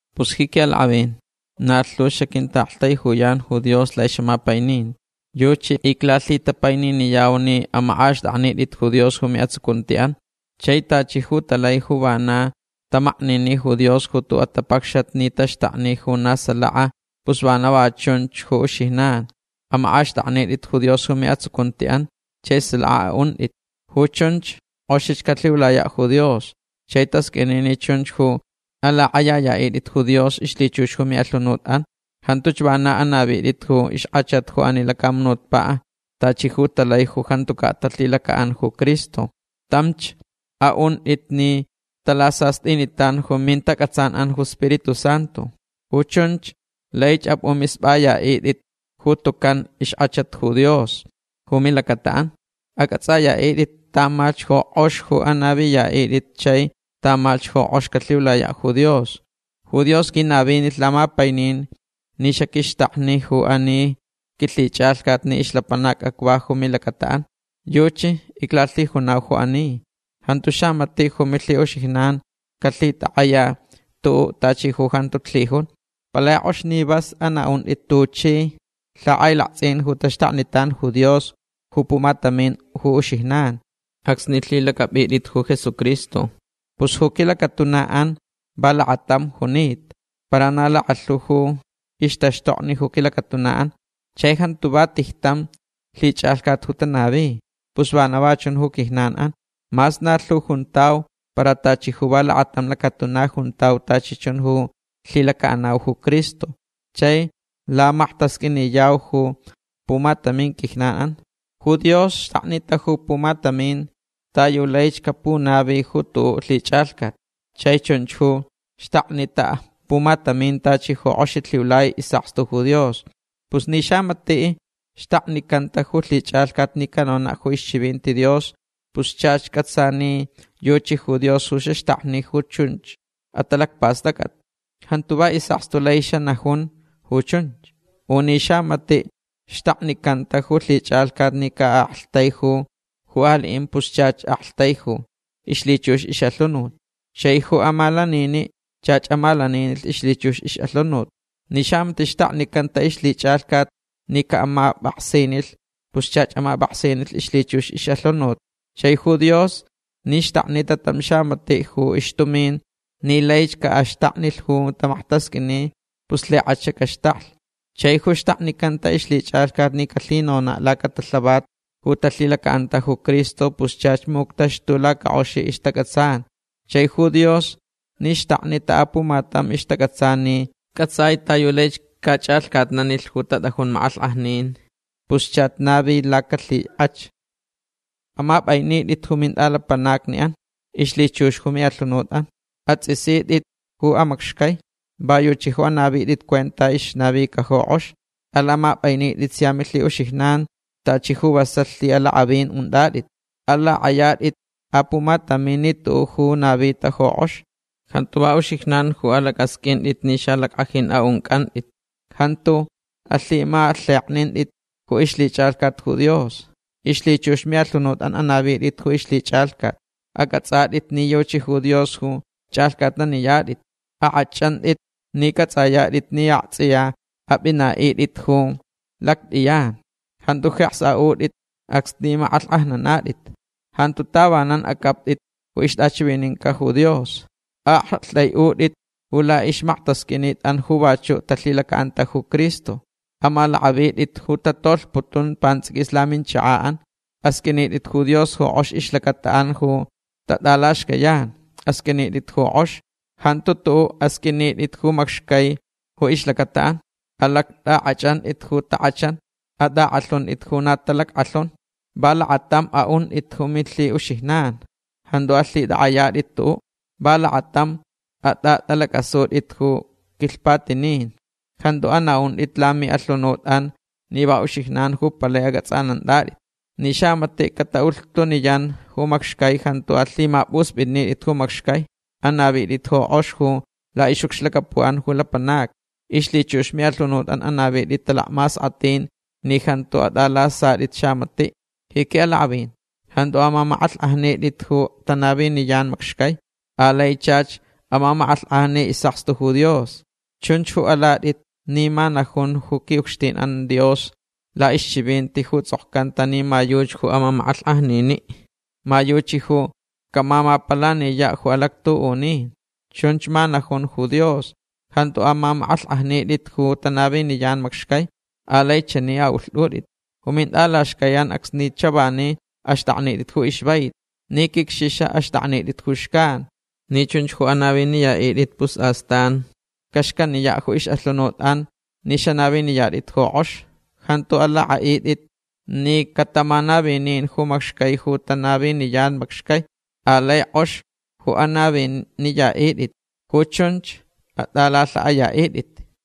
Pus ji quiʼalakʼavin na lhu xaquintaʼaktaijuyan ju Dios laʼixʼamapaininti. Yuchi iclalhitapaininiyau ni amakʼaxtʼaknitʼit ju Dios ju miʼatsucuntiʼan. Chai tachi ju talai ju vana tamaknini ju Dios ju tuʼuʼ atapacxat ni taxtakni ju na salaka pus vana va chunch ju uxijnan. Amakʼaxtʼaknitʼit ju Dios ju miʼatsucuntiʼan chai salaka aʼuntʼit. Ju chunch kʼoxich calhiulayaʼ ju Dios. Chai tasqʼuini ni chunch ju alakʼayayaʼitʼit ju Dios ixlhichux ju miʼalhunutʼan. Jantuch vana anavitʼit ju ixkʼachat ju ani lacamunutpaʼ tachi ju talai ju jantucaʼ talhilacaʼanta ju Cristo. Tamch aʼuntʼit ni talasastʼinitan ju mintacʼatsanʼan ju Spiritu Santu. Ju chunch laich apʼumispʼayaʼitʼit ju tucan ixkʼachat ju Dios ju milacataʼan. Acʼatsʼayaʼitʼit tamalhch ju kʼox ju anaviyaʼitʼit chai tamalhch ju kʼox calhiulayaʼ ju Dios. Ju Dios quinavinilh lamapainin ni xaquixtaknich ju ani quilhichʼalhcat ni ixlapanac acva ju milacataʼan. Yuchi iclalhijunau ju ani. Jantu xamatiʼ ju milhiʼuxijnan calhitakʼaya tuʼuʼ tachi ju jantuch lhijun. Palai kʼox ni vas anaʼuntʼit tuchi lhakʼailaktsʼin ju taxtaknitan ju Dios ju pumatamin ju uxijnan acsni lhilacʼapʼitʼit ju Jesucristo. Pus ju quilacatunaʼan va lakatamch junita. Para na lakalhu ju ixtaxtokni ju quilacatunaʼan. Chai jantu va tijtam lhichʼalhcat ju tanavi. Pus vana va chun ju quijnanʼan. Mas na lhu juntau para tachi ju va lakatam lacatuna juntau tachi chun ju lhilacaʼanau ju Cristo. Chai lamaktasqʼuiniyau ju pumatamin quijnanʼan. Ju Dios xtaknita ju pumatamin ta yu laich capunavi ju tuʼuʼ lhichʼalhcat. Chai chunch ju xtaknita pumatamin tachi ju kʼoxich lhiulai isʼakstu ju Dios. Pus ni xamatiʼ xtaknicanta ju lhichʼalhcat ni canonaʼ ju ixchivinti Dios pus chach cʼatsa ni yuchi ju Dios ju xaxtakni ju chun atalacpastʼacʼat. Jantu va isʼakstu lai xanajun ju chunch. U ni xamatiʼ xtaknicanta ju lhichʼalhcat ni caʼaktaijulh ju aliʼin pus chach aktaiju ixlhichux ixʼalhunut. Chai ju amalaniniʼ chach amalaninilh ixlhichux ixʼalhunut. Ni xamatiʼ xtaknicanta ixlhichʼalhcat ni caʼamapʼaksinilh pus chach amapʼaksinilh ixlhichux ixʼalhunut. Chai ju Dios ni xtaknita tam xamatiʼ ju ixtumin ni laich caʼaxtaknilh ju tamaktasqʼuini pus lhikʼach caxtaklh. Chai ju xtaknicanta ixlhichʼalhcat ni calhinonaʼ lacatalhavat ju talhilacaʼanta ju Cristo pus chach muctaxtu lacakʼox ixtacʼatsan. Chai ju Dios ni xtaknita apumatam ixtacʼatsan ni cʼatsai ta yu laich cachʼalhcatnanilh ju tatʼajun makʼalhkʼajnin pus chach navi lacalhikʼach. Amapʼainitʼit ju mintʼalapanacniʼan ixlhichux ju miʼalhunutʼan. Atsʼisitʼitch ju amacxcai. Va yuchi ju anavitʼit cuenta ixnavica ju kʼox. Alamapʼainitʼit sia milhiʼuxijnan tachi ju vasalh lhiʼalakʼavin untʼatʼit. Alakʼayatʼit apumatam ni tuʼuʼ ju navita ju kʼox. Jantu va uxijnan ju alacʼasqʼuintʼit ni xalackʼajin aʼuncʼantʼit. Jantu alhimalheknintʼit ju ixlhichʼalhcat ju Dios. Ixlhichux miʼalhunutʼan anavitʼit ju ixlhichʼalhcat. Acʼatsʼatʼit ni yuchi ju Dios ju chʼalhcʼatnaniyatʼit. Akʼachʼantʼit ni cʼatsʼayatʼit ni aktsʼiya apʼinaʼitʼit ju lactʼiyan. Jantu jeks aʼutʼit acsni makʼalhkʼajnanatʼit. Jantu tavanan acʼaptʼit ju ixtʼachivininca ju Dios. Aʼaktʼaiʼutʼit ju laʼixmaktasqʼuinitʼan ju vachuʼ talhilacaʼanta ju Cristo. Amalakʼavitʼitch ju tatolhputun pantsʼiquis laminchakaʼan. Asqʼuinitʼit ju Dios ju kʼox ixlacataʼan ju tatʼalaxcayan. Asqʼuinitʼit ju kʼox. Jantu tuʼuʼ asqʼuinitʼit ju macxcai ju ixlacataʼan. Alactʼakʼachʼantʼit ju takʼachan. Atʼakʼalhuntʼit ju na talackʼalhunch. Va lakatamch aʼuntʼit ju milhiʼuxijnan. Jantu alhitʼakʼayatʼit tuʼuʼ. Va lakatamch atʼatʼalacʼasutʼit ju quilhpatinin. Jantu anaʼuntʼit lamiʼalhunutʼan ni va uxijnan ju palai acʼatsʼanantʼatʼit. Ni xamatiʼ cataʼulhtuniyan ju macxcai jantu alhimapʼuspʼitnitʼit ju macxcai. Anavitʼit ju kʼox ju laʼixʼucxlacapuʼan ju lapanacni. Ixlhichux miʼalhunutʼan anavitʼit talacmaskʼatʼin ni jantu atʼalasatʼit xamatiʼ. Ji quiʼalakʼavin jantu amamakʼalhkʼajnitʼit ju tanaviniyan macxcai. Alai chach amamakʼalhkʼajni isʼakstu ju Dios. Chunch ju alatʼit ni ma najun ju quiʼucxtinʼan Dios laʼixchivinti ju tsʼokcanta ni ma yuchi ju amamakʼalhkʼajniniʼ. Ma yuchi ju camamapalaniyaʼ ju alactuʼunin. Chunch ma najun ju Dios. Jantu amamakʼalhkʼajnitʼit ju tanaviniyan macxcai. Alai chani aʼulhtʼutʼit. Ju mintʼalaxcaiʼan acsni chavani axtʼaknitʼit ju ixvaiti. Ni quicxixa axtʼaknitʼitch ju xcan. Ni chunch ju anaviniyaʼitʼit pus astan caxcaniyaʼ ju ixʼalhunut ni xanaviniyatʼit ju kʼox. Jantu alakʼaʼitʼit ni catamanavinin ju macxcai ju tanaviniyan macxcai. Alai kʼox ju anaviniyaʼitʼit. Ju chunch atʼalalhaʼayaʼitʼit.